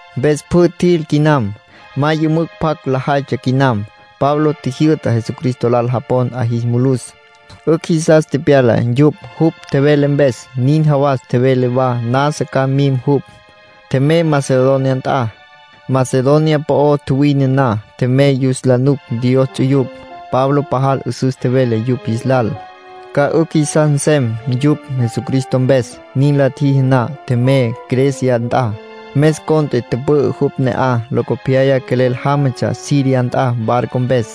Mpes pjü tjil quinam. Ma yümücj pjac lajaytsja quinam. Pablo tjijyü'ta Jesucristo lal japon 'a jis mulus. 'Ücj jisas tepyala yupj jupj tjevele mpes. Nin jawas tjevele wa nasa ca mim jupj. Tjemey Macedonia nt'a. Macedonia po'o tjuwine na, tjemey yus la nuc Dios ts'uyupj. Pablo pajal 'üsüs tjevele yupj jis lal, ca 'ücj jisas nsem yupj Jesucristo mpes. Nin la tjiji na, tjemey Grecia nt'a. Mes cont'e tüpü'ü jupj ne'aj. Locopyaya quelel jámatsja Siria nt'a barco mpes.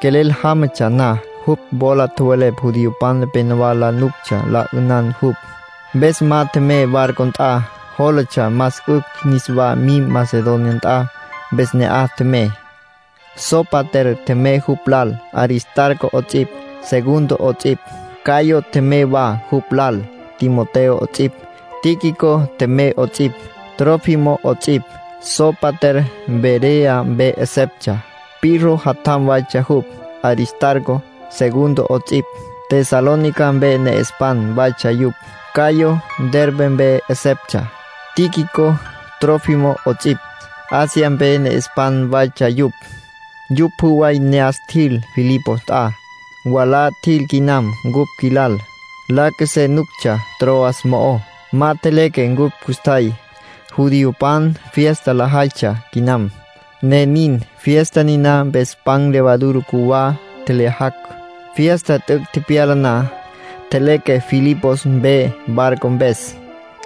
Quelel jámatsja na, jupj wola tjowelepj judiopan nepenowá la nuctsja la 'ünan jupj. Mpes ma tjemey barco nt'a. Jólatsja más 'ücj niswá mim Macedonia nt'a. Mpes ne'aj tjemey. Sópater tjemey jupj lal, Aristarco 'ots'ipj, Segundo 'ots'ipj. Gayo tjemey wa jupj lal, Timoteo 'ots'ipj. Tíquico tjemey 'ots'ipj, Trófimo 'ots'ipj. Sópater Berea mpe 'eseptsja. Pirro jatjam waytsja jupj. Aristarco, Segundo 'ots'ipj, Tesalónica mpe ne'espan waytsja yupj. Gayo Derbe mpe 'eseptsja. Tíquico, Trófimo 'ots'ipj, Asia mpe ne'espan waytsja yupj. Yupj pjü way ne'as tjil Filipos nt'a. Mwalá tjil quinam cupj qjuilal. La qjuesé nuctsja Troas mo'ó. Ma tjeleque cupj custjay. Judiopan fiesta lajaytsja quinam, ne nin. Fiesta niná mpes pan levadura cjuwá tjelyajacj. Fiesta t'üc' tepyala na, tjeleque Filipos mpe barco mpes.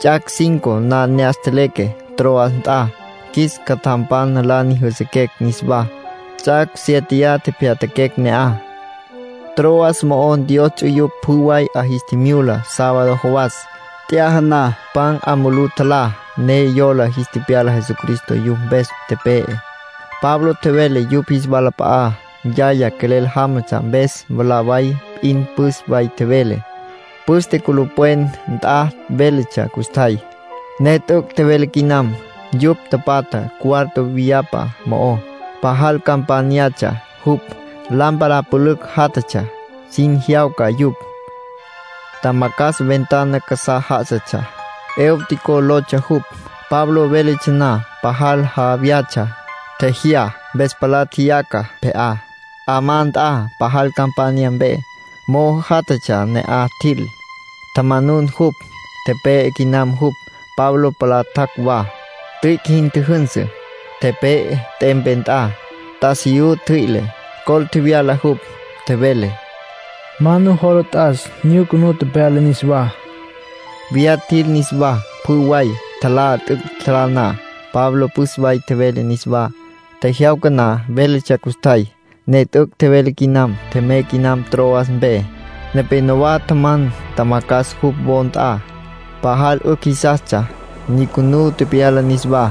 Ts'ac' cinco na ne'as tjeleque Troas nt'a. Qjuis catjampan la nyüjüsüquecj niswá. Ts'ac' siéteya tepyatjaquecj ne'aj. Troas mo'ó Dios ts'uyupj pjü way 'a jis tjimyula sábado jawas, t'yaja na. Pan 'a mulú tjalá, ne yola jis tepyala Jesucristo yupj mpes tepe'e. Pablo tjevele yupj jis walap'a'á. Yaya quelel jámatsja, mpes mwalá way p'in püs way tjevele. Püste culupwen nt'a véletsja custjay, ne t'üc' tjevele quinam. Yupj tapatja cuarto viyapa mo'ó, pajal campányatsja jupj. Lámpara pülücj játjatsja, sin jyawca yupj. Tjamacjas ventana casá já'asatsja. Eutico lotsja jupj. Pablo véletsja na, pajal ja vyatsja. Tjejyá, mpes palá tjeyaca pje'á, 'amá nt'a, pajal campanya mpe. Mo'o játjatsja ne'aj tjil, tjamanun jupj. Tepe'e quinam jupj. Pablo palá tjac' wa. Tüic' jin tjüjünsü, tepe'e t'empe nt'a, t'asiyú ntjüi'le, col tjevyala jupj. Tjevele: “Ma nujola t'as. Nyucunú tepyala niswá.” Viyá tjil niswá, pjü way. Tjalá. T'üc' tjalá na, Pablo püs way tjevele niswá. Tjejyawca na véletsja custjay, ne t'üc' tjevele quinam. Tjemey quinam Troas mpe. Nepénowa tjaman tjamacjas jupj wo nt'a. Pajal 'ücj jisastsja, nyucunú tepyala niswá.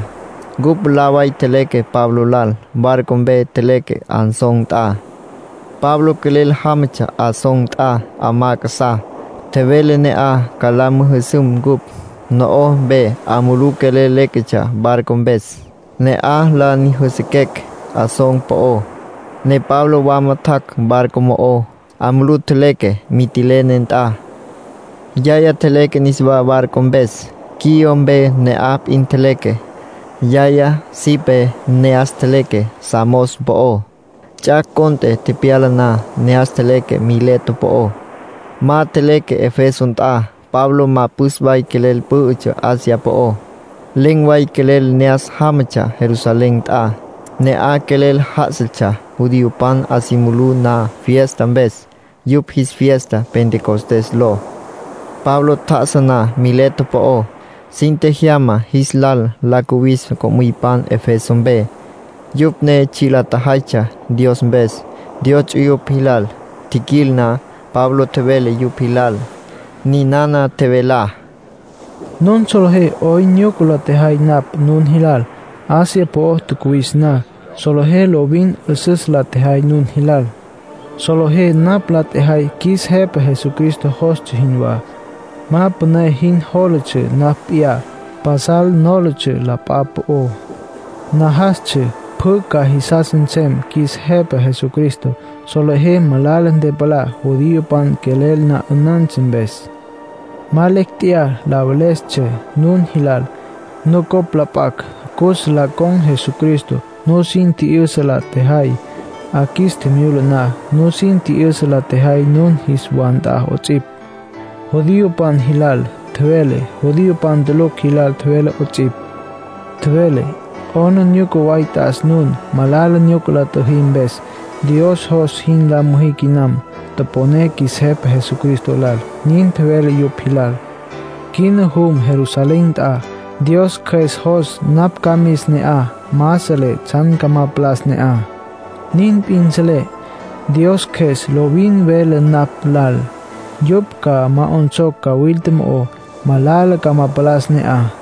Ncupj mwalá way tjeleque Pablo lal. Barco mpes tjeleque Asón nt'a. Pablo quelel jámatsja Asón nt'a 'amá casá. Tjevele ne'aj ca la müjüsüm cupj. No'oj mpe 'a mulú quelel léquetsja barco mpes. Ne'aj la nyüjüsüquecj Asón po'ó, ne Pablo wama tjac' barco mo'ó. 'A mulú tjeleque Mitilene nt'a. Yaya tjeleque niswá barco mpes. Quío mpe ne'aj p'in tjeleque. Yaya sipé ne'as tjeleque Samos po'ó. Ts'ac' cont'e tepyala na, ne'as tjeleque Mileto po'ó. Ma tjeleque Efeso nt'a; Pablo ma püs way quelel pǘ'ütsja Asia po'ó. Len̈ way quelel ne'as jámatsja Jerusalén nt'a. Ne'aj quelel já'asatsja, judiopan 'a si mulú na fiesta mpes, yupj jis fiesta Pentecostés ló. Pablo tjá'asa na Mileto po'ó, sin tjejyama jis lal la cuwis co'müypan Efeso mpe, yupj ne tsji' lajaytsja Dios mpes Dios ts'uyupj jilal. Tjiquil na, Pablo tjevele yupj jilal. Ninana tjevelá: “Nun solejé 'oyn nyuca la tjejay napj nun jilal Asia po'o tjacuwis na. Solejé lovin 'üsüs la tjejay nun jilal. Solejé napj la tjejay qjuis Jepa Jesucristo jostsja jinwá. Ma püné jin nólatsja napj p'iyá. Pasal nólatsja la p'a po'ó; najastsja pjü ca jisas nsem qjuis Jepa Jesucristo. Solejé malala ntepalá, judiopan quelel na 'ünantsja mpes. Ma lecj tjeyá la velestsja nun jilal, nucopj la p'acj cus la con̈ Jesucristo. Nusin tji'yüsa la tjejay 'a qjuis tjimyula na. Nusin tji'yüsa la tjejay nun jis wa nt'a 'ots'ipj. Judiopan jilal tjevelé, judiopan tulucj jilal tjevelé 'ots'ipj. Tjevelé: ‘'Aplijila way t'as nun, malala nyuca la tjüjí mpes. Dios jos jin la müjí quinam. Toponé qjuis Jepa Jesucristo lal’, nin tjevelé yupj jilal. ”Quina jum Jerusalén nt'a. Dios Cjües jos napj ca mis ne'aj. Ma selé tsjan ca ma palas ne'aj. Nin p'in selé: Dios Cjües lovin vele napj lal yupj ca ma 'onsocj cawilta mo'ó, malala ca ma palas ne'aj.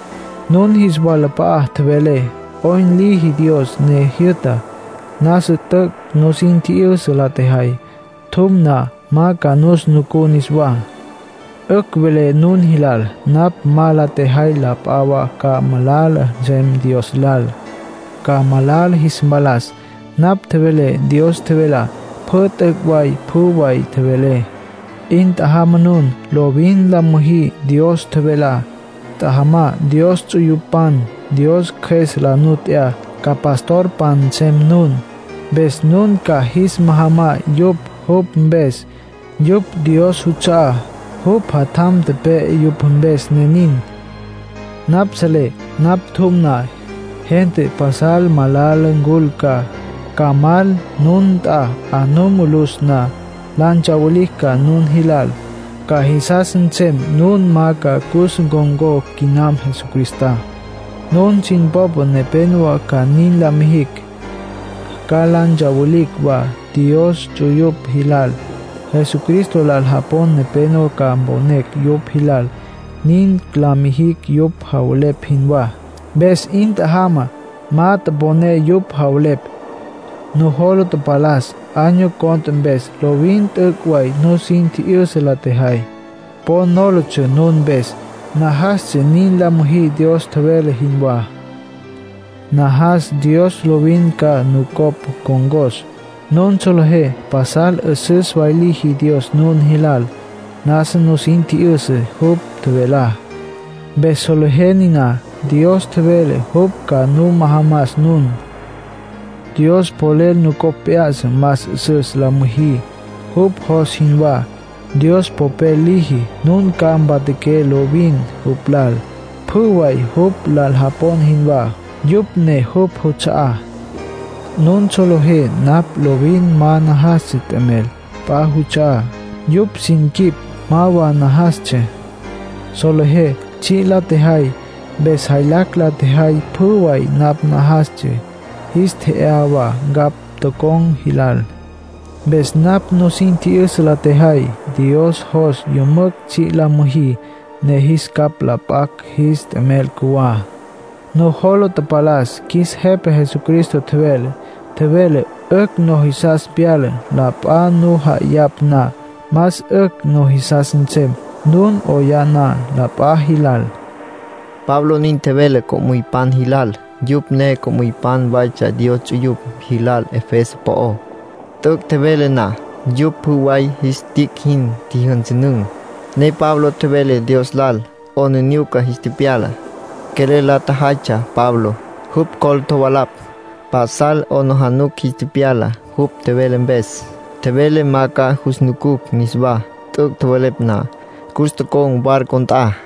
”Nun jis walap'a'a tjevelé 'oyn liji Dios ne jyü'ta. Nasa t'üc' nusin tji'yüsa la tjejay. Tjum na, ma ca nus nucú niswá. 'Ücj velé nun jilal napj ma la tjejay la p'a wa ca malala nsem Dios lal, ca malala jis mpalas. Napj tjevelé Dios tjevelá, pjü. T'üc' way pjü way tjevelé. 'In tjajamá nun, lovin la müjí Dios tjevelá. Tjajamá Dios ts'uyupan. Dios Cjües la nu t'ya, ca pastorpan nsem nun, mpes nun ca jis majamá yupj jupj mpes. Yupj Dios juts'a'á. Jupj Jatjam tepe'e yupj mpes, ne nin. ”Napj selé napj tjum na, gente pasal malala ncul ca, ca mal nun nt'a 'a nu mulus na. La ntsawilicj ca nun jilal. Ca jisas nsem nun ma ca cus ncon̈có quinam Jesucristá. Nun sin popa nepenowá ca nin la mijicj. Ca la ntsawilicj wa Dios ts'uyupj jilal. Jesucristo lal japon nepenowá ca mponecj yupj jilal. Nin ca la mijicj yupj javelepj jinwá. Mpes 'in tjajamá. Ma toponé yupj javelepj. Nujola tapalas año cont'e mpes lovin t'üc' way nusin tji'yüsa la tjejay. Po nólatsja nun mpes. Najastsja nin la müjí Dios tjevele jinwá. ”Najas Dios lovin ca nucopj ncon̈cos. Nun solejé pasal 'üsüs way liji Dios nun jilal. Nasa nusin tji'yüsa jupj tjevelá, mpes solejé niná. Dios tjevele jupj ca nu majamas nun. Dios polel nucopj p'ya'sa más 'üsüs la müjí, jupj jos jinwá. Dios polel liji nun ca mpatjaqué lovin jupj lal, pjü way jupj lal japon jinwá, yupj ne jupj juts'a'á. Nun solejé napj lovin ma najastsja t'emel p'a juts'a'á. Yupj sin quip ma wa najastsja. Solejé tsji' la tjejay, mpes jaylacj la tjejay pjü way napj najastsja. Jis tje'yá wa ncapj tocon̈ jilal. Mpes napj nusin tji'yüsa la tjejay Dios jos yümücj tsji' la müjí, ne jis capj mp'a'sá jis t'emel cjuwá. Nujola tapalas qjuis Jepa Jesucristo tjevelá. Tjevele: ‘'Ücj nujisas pyala la p'a nu ja'ayapj na. Más 'ücj nujisas nsem nun 'oyá na la p'a jilal’”, Pablo nin tjevele co'müypan jilal. Yupj ne co'müypan waytsja Dios ts'uyupj jilal Efeso po'ó. T'üc' tjevele na, yupj pjü way jis tic' jin tjijyünsünün̈, ne Pablo tjevele Dios lal. 'Aplijila jis tepyala. Quelel la tjajaytsja Pablo. Jupj col tjovalapj. Pasal 'aplijila jis tepyala jupj tjevele mpes. Tjevele ma ca jus nucucj niswá. T'üc' tjowelepj na, cus tocon̈ barco nt'a.